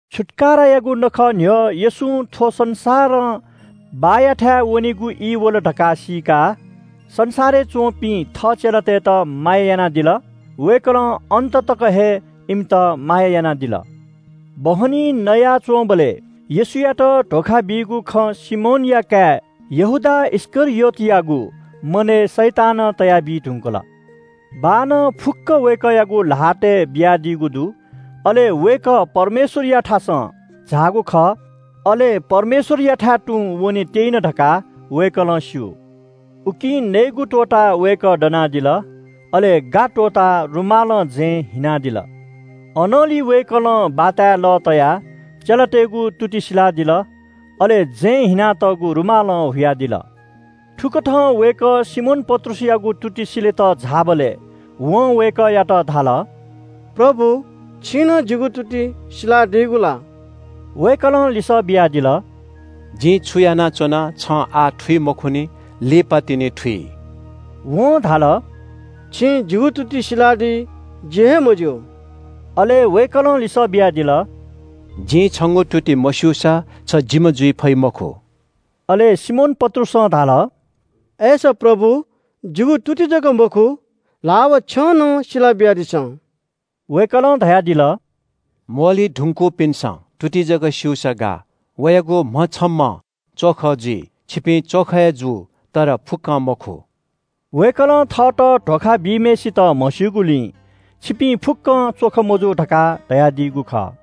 छुत्‍काराया नखः न्‍ह्यः येशूं थ्‍व संसारं बाःयाथाय् वनेगु ई वल धकाः सीकाः संसारय् च्‍वंपिं थः चेलातय्‌त माया यानादिल। वय्‌कलं अन्‍ततक हे इमित माया यानादिल। बहनी नयाच्‍वंबलय् येशूयात धोखा बीगु खँ सिमोनया काय् यहूदा इस्‍करियोतयागु मनय् शैतानं तयाबी धुंकल। बाःनं फुक्‍कं वय्‌कःयागु ल्‍हातय् बियादीगु दु, अले वय्‌कः परमेश्‍वरयाथासं झाःगु खः, अले परमेश्‍वरयाथाय् तुं वने त्‍यइन धकाः वय्‌कलं स्‍यू। उकिं नयेगु त्‍वःताः वय्‌कः दनादिल। अले गा त्‍वःताः रुमालं जँय् हिनादिल। अनंलि वय्‌कलं बाताय् लः तयाः चेलातय्‌गु तुति सिलादिल, अले जँय् हिनातःगु रुमालं हुयादिल। थुकथं वय्‌कः सिमोन पत्रुसयागु तुति सिलेत झाःबलय् वं वय्‌कःयात धाल – “प्रभु, छिं नं जिगु तुति सिलादीगु ला?” वय्‌कलं लिसः बियादिल – “जिं छु यानाच्‍वना छं आः थुइ मखुनि, लिपातिनि थुइ।” वं धाल – “छिं जिगु तुति सिलादी जि हे मज्‍यू।” अले वय्‌कलं लिसः बियादिल – “जिं छंगु तुति मस्‍यूसा छ जिम्‍ह जुइ फइ मखु।” अले सिमोन पत्रुसं धाल – “अय्‌सा प्रभु, जिगु तुति जक मखु, ल्‍हाः व छ्यं नं सिला बियादिसँ।” वय्‌कलं धयादिल – “म्‍वःल्‍हुइ धुंकूपिन्‍सं तुति जक स्‍यूसा गाः, वयागु म्‍हछम्‍हं च्‍वख जुइ। छिपिं च्‍वख हे जू, तर फुक्‍कं मखु।” वय्‌कलं थःत धोखा बीम्‍हय्‌सित म्‍हस्‍यूगुलिं “छिपिं फुक्‍कं च्‍वख मजू” धकाः धयादीगु खः।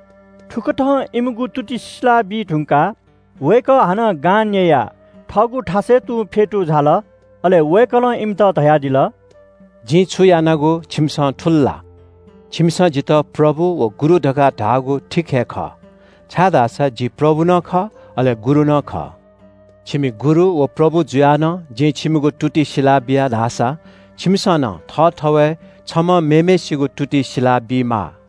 थुकथं इमिगु तुति सिला बीधुंकाः वय्‌कः हानं गां न्‍ययाः थःगु थासय् फ्‍यतू झाल। अले वय्‌कलं इमित धयादिल – “जिं छु यानागु छिमिसं थुल ला? छिमिसं जितः प्रभु व गुरु धकाः धाःगु ठीक हे खः, छाय्‌धाःसा जि प्रभु नं खः, अले गुरु नं खः। छिमि गुरु व प्रभु जुयाः नं जिं छिमिगु तुति सिलाबिया धाःसा छिमिसं नं थःथवय् छम्‍हं मेम्‍हय्‌सिगु तुति सिला बीमाः।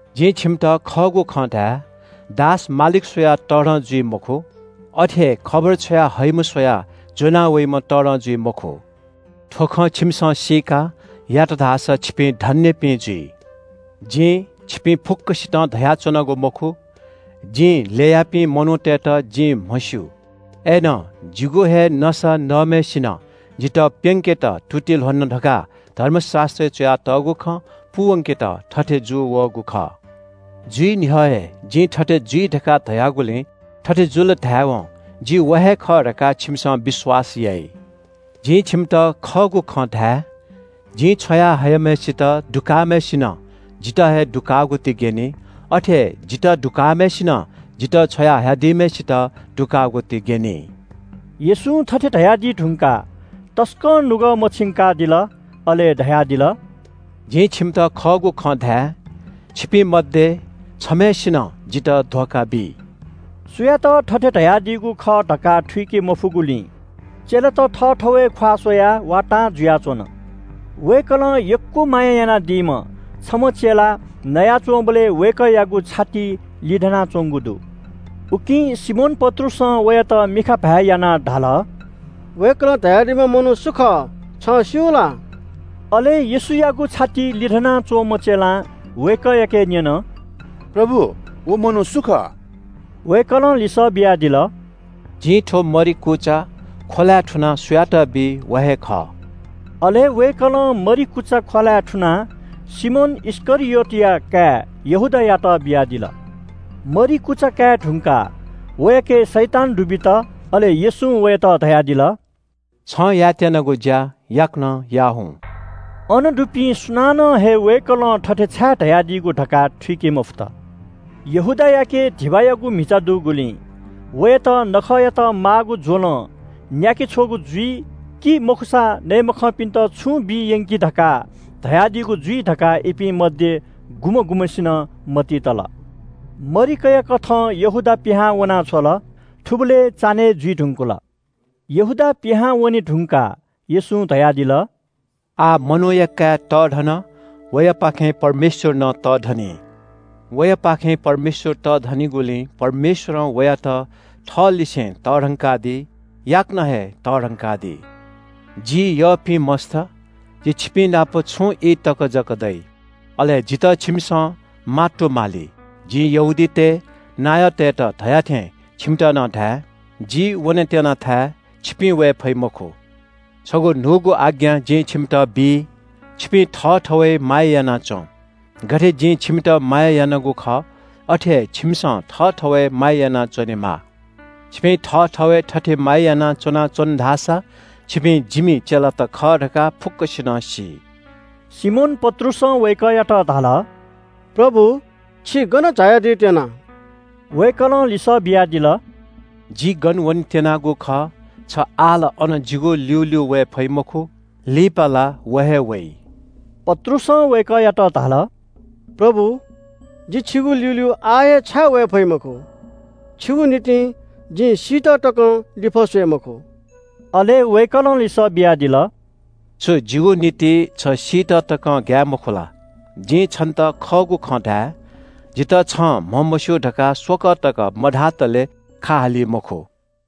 जिं छिमित खःगु खँ धाये – दास मालिक स्‍वयाः तःधं जुइ मखु। अथे हे खबर छ्वया हइम्‍ह स्‍वयाः ज्‍वना वइम्‍ह तःधं जुइ मखु। थ्‍व खँ छिमिसं सीकाः यात धाःसा छिपिं धन्‍यपिं जुइ। “जिं छिपिं फुक्‍कसितं धयाच्‍वनागु मखु। जिं ल्‍ययापिं मनूतय्‌त जिं म्‍हस्‍यू। अय्‌नं ‘जिगु हे नसा नःम्‍हय्‌सिनं जितः प्‍यंकेत तुति ल्‍ह्वन’ धकाः धर्मशास्‍त्रय् च्‍वयातःगु खँ पूवंकेत थथे जूवःगु खः। जुइ न्‍ह्यः हे जिं थथे जुइ धकाः धयागुलिं थथे जुल धाय्‌वं जि व हे खः धकाः छिमिसं विश्‍वास याइ। जिं छिमित खःगु खँ धाये – जिं छ्वया हयाम्‍हय्‌सित दुकाःम्‍हय्‌सिनं जितः हे दुकाःगु ति ग्‍यनी। अथे हे जितः दुकाःम्‍हय्‌सिनं जितः छ्वया हयादीम्‍हय्‌सित दुकाःगु ति ग्‍यनी।” येशूं थथे धयादी धुंकाः तसकं नुगः मछिंकादिल, अले धयादिल – “जिं छिमित खःगु खँ धाये – छिपिं मध्‍ये छम्‍हय्‌सिनं जितः धोखा बी।” सुयात थथे धयादीगु खः धकाः थुइके मफुगुलिं चेलात थःथवय् ख्‍वाः स्‍वयाः वातां जुयाच्‍वन। वय्‌कलं यक्‍व माया यानादीम्‍ह छम्‍ह चेला नयाच्‍वंबलय् वय्‌कःयागु छातिइ लिधनाच्‍वंगु दु। उकिं सिमोन पत्रुसं वयात मिखा भाय् यानाः धाल – “वय्‌कलं धयादीम्‍ह मनू सु खः, छं स्‍यू ला?” अले येशूयागु छातिइ लिधना च्‍वंम्‍ह चेलां वय्‌कःयाके न्‍यन “प्रभु, व मनू सु खः?” वय्‌कलं लिसः बियादिल – “जिं थ्‍व मरि कुचा ख्‍वलाय् थुनाः सुयात बी, व हे खः।” अले वय्‌कलं मरि कुचा ख्‍वलाय् थुनाः सिमोन इस्‍करियोतया काय् यहूदायात बियादिल। मरि कुचा काये धुंकाः वयाके शैतान दुबित। अले येशूं वयात धयादिल – “छं यायेत्‍यनागु ज्‍या याकनं याः हुँ।” अन दुपिं सुनानं हे वय्‌कलं थथे छाय् धयादीगु धकाः थुइके मफुत। यहूदायाके धिबायागु म्‍हिचा दुगुलिं वयात नखःयात माःगु ज्‍वलं न्‍याके छ्वःगु जुइ, कि मखुसा नये मखंपिन्‍त छुं बी यंकि धकाः धयादीगु जुइ धकाः इपिं मध्‍ये गुम्‍ह गुम्‍हय्‌सिनं मतिइ तल। मरि कयाकथं यहूदा पिहां वना छ्वल। थुबलय् चान्‍हय् जुइ धुंकल। यहूदा पिहां वने धुंकाः येशूं धयादिल – “आः मनूया काय् तःधन। वयापाखें परमेश्‍वर नं तःधनी। वयापाखें परमेश्‍वर तःधनिगुलिं परमेश्‍वरं वयात थःलिसे तःधंकादी, याकनं हे तःधंकादी। जि यःपिं मस्‍त, जि छिपिंनाप छुं ई तक जक दइ। अले जितः छिमिसं मात्तुमाली। जिं यहूदीतय् नायःतय्‌त धया थें छिमित नं धाये – ‘जि वनेत्‍यनाथाय् छिपिं वये फइ मखु।’ छगू न्‍हूगु आज्ञा जिं छिमित बीत्‍यना। छिपिं थःथवय् माया याना च्‍वँ। गथे जिं छिमित माया यानागु खः, अथे हे छिमिसं थःथवय् माया यानाच्‍वनेमाः। छिपिं थःथवय् थथे माया याना च्‍वनाच्‍वन धाःसा छिपिं जिमि चेलात खः धकाः फुक्‍कसिनं सी।” सिमोन पत्रुसं वय्‌कःयात धाल – “प्रभु, छि गन झायादी त्‍यना?” वय्‌कलं लिसः बियादिल – “जि गन वनेत्‍यनागु खः छ आः ला अन जिगु ल्‍यूल्‍यू वये फइ मखु, लिपा ला व हे वइ।” पत्रुसं वय्‌कःयात धाल – “प्रभु, जि छिगु ल्‍यूल्‍यू आः हे छाय् वये फइ मखु? छिगु निंतिं जिं सीत तक नं लिफः स्‍वये मखु।” अले वय्‌कलं लिसः बियादिल – “छु जिगु निंतिं छ सीत तकं ग्‍याये मखु ला? जिं छन्‍त खःगु खँ धाये – जितः छं म्‍हमस्‍यू धकाः स्‍वकः तक मधातले खा हाली मखु।”